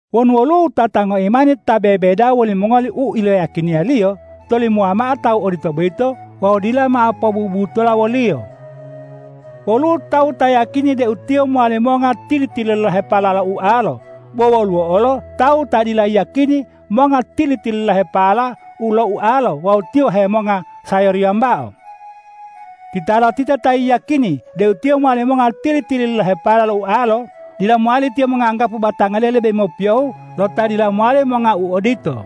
Wonu woluwo wutata ngoimani ta bebedawa wolimongoli u iloyiyakiniyaliyo, tolimowa mao tawu odito boyito wawu dila mao pobubutola woliyo. Woluwo tawu ta yiyakini deu tiyo mowali monga tili-tililahepala lo ualolo. Bo woluwo olo tawu ta dila yiyakini monga tili-tililahepala lo ualolo wawu tiyo bo hemonga sayori wambao. Titalotita ta yiyakini deu tiyo mowali monga tili-tililahepala lo ualolo, dila mowali tiyo monganggapu batangaliyo lebe mopiyoheo lo ta dila mowali monga u odito.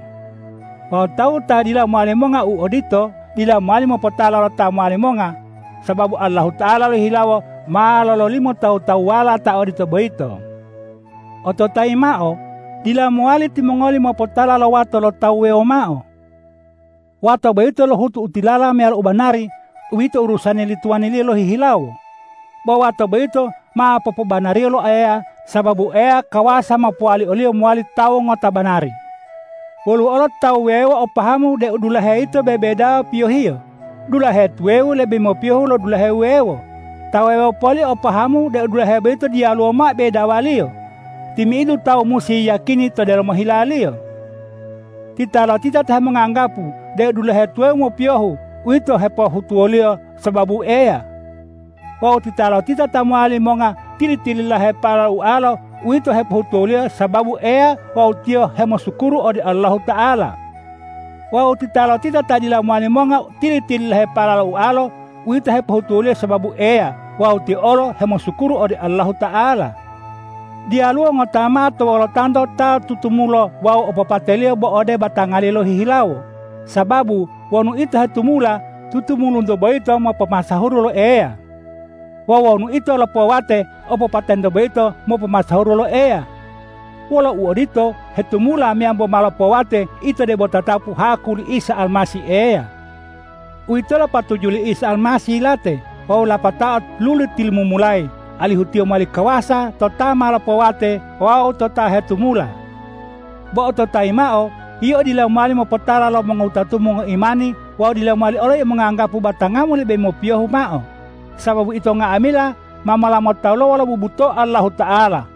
Wawu tawu ta dila mowali monga u odito, dila mowali mopotala lo ta mowali monga, sababu Allahuta'ala lohihilawo ma lololimo tawu-tawuwala ta odito boyito. Ototayi mao: Dila mowali timongoli mopotala lo wato lo tawu wuwewo mao. Wato boyito lohutu u tilala meyalo u banari, uwito urusani li tuwaniliyo lohihilawo. Bo wato boyito ma popobanariyo lo Eya, sababu Eya kawasa mopowali oliyo mowali tawu ngota banari. Woluwo olo tawu wuwewo o pahamu deu dulahe yito bebedawa piyohiyo, dulahe tuwawu lebe mopiyoheo lo dulahe wuwewo. Ta wuwewo poli o pahamu deu dulahe boyito diyaluwo mao bedawaliyo. Timi'idu tawu musi yiyakini to delomo hilaliyo. Titalotita ta hemonganggapu deu dulahe tuwawu mopiyohu, uwito hepohutuwoliyo sababu Eya. Wawu titalotita ta mowali monga tili-tililahepala lo ualolo, uwito hepohutuwoliyo sababu Eya wawu tiyo hemosukuru ode Allahuta'ala. Wawu titalotita ta dila mowali monga tili-tililahepala lo ualolo, uwito hepohutuwoliyo sababu Eya wawu tiyo olo hemosukuru ode Allahuta'ala. Diyaluwo ngota mao to wolotanto ta tutumulo wawu opopateliyo bo ode batangaliyo lohihilawo. Sababu wonu ito hetumula, tutumulunto boyito mopomasahuru lo Eya; wawu wonu ito lopowate, opopatento boyito mopomasahuru lo Eya. Wolo uodito, hetumula meyambo ma lopowate, ito debo tatapu haku li Isa Almasih Eya. Uwitolo patuju li Isa Almasih yilate wawu lapatao luli tilumumulayi, alihu Tiyo mowali kawasa to ta ma lopowate wawu to ta hetumula. Bo ototayi mao, yio dila mowali mopotala lo mongowutatumu ngoimani wawu dila mowali olo yio monganggapu batangamu lebe mopiyohiyo mao, sababu ito nga'amila ma mola motaluwa wolo bubuto'o Allahuta'ala.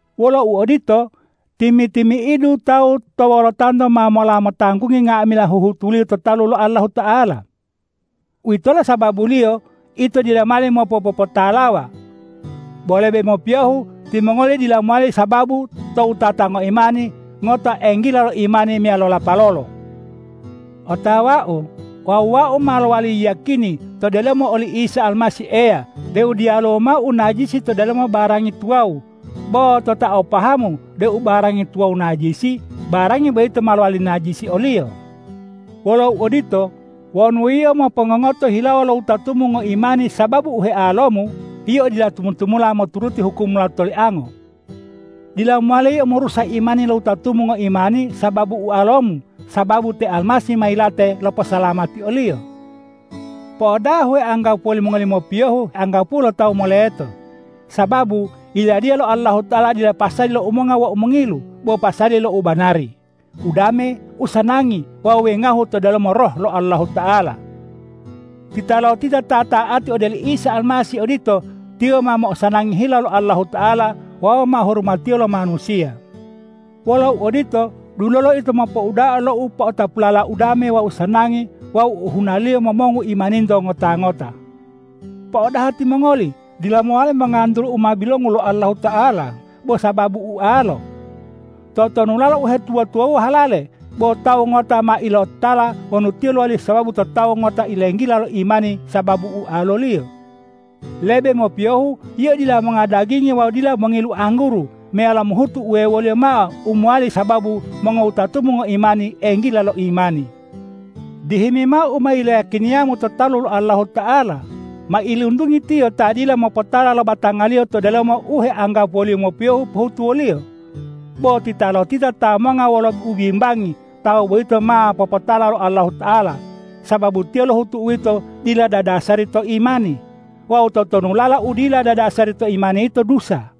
Wolo uodito, timi-timi'idu tawu to wolotanto ma mola motanggungi nga'amila huhutuliyo to talu lo Allahuta'ala. Uwitolo sababuliyo ito dila mowali mopopotalawa. Bo lebe mopiyohu timongoli dila mowali sababu to wutata ngoimani ngota enggila lo imani meyalo lapalolo. Otawau wawu wau ma lowali yiyakini to delomo oli Isa Almasih Eya deu diyaluwo mao u najisi to delomo barangi tuwawu. Bo to ta o pahamu deu barangi tuwawu najisi, barangi boyito ma lowali najisi oliyo. Wolo uodito, wonu yio mopongongoto hilawo lo wutatumu ngoimani sababu u healomu, yio dila tumu-tumula moturuti hukum lo tolianga. Dila mowali yio morusa imani lo wutatumu ngoimani sababu ualomu, sababu te Almasih ma yilate loposalamati oliyo. Po'odaha u heanggapuwo limongoli mopiyohu, anggapuwo lo tawu moleto. Sababu Yiladiya lo Allahuta'ala dila pasali lo umonga wawu mongilu, bo pasali lo ubanari, udame, usanangi wawu wengahu to delomo Roh lo Allahuta'ala. Titalotita ta ta'ati ode oli Isa Almasih odito, tiyo ma mo'osanangi hila lo Allahuta'ala wawu ma hurumatiyo lo manusiya. Wolo uodito, dulolo ito mopouda'a lo u po'otapulala udame wawu sanangi wawu u ohunaliyo momongu imaninto ngota-ngota. Po'odaha timongoli, dila mowali mongantulu u ma bilongu lo Allahuta'ala bo sababu ualo! Totonulala uhetuwa-tuwawuwa halale, bo tawu ngota ma ilototala wonu tiyo lowali sababu to tawu ngota ilenggila lo imani sababu ualoliyo! Lebe mopiyohu yio dila monga dagingi wawu dila mongilu angguru, meyalo mohutu uwewoliyo mao u mowali sababu mongowutatumu ngoimani enggila lo imani. Dihimi mao u ma iloyakiniyamu to talu lo Allahuta'ala. Mailuntungi tiyo ta dila mopotala lo batangaliyo to delomo u heanggapuwoliyo mopiyohu pohutuwoliyo. Bo titalotita ta monga wolo ubimbangi, tawu boyito ma popotala lo Allahuta'ala, sababu tiyo lohutu uwito dila dadasari to imani. Wawu totonulala u dila dadasari to imani yito dusa.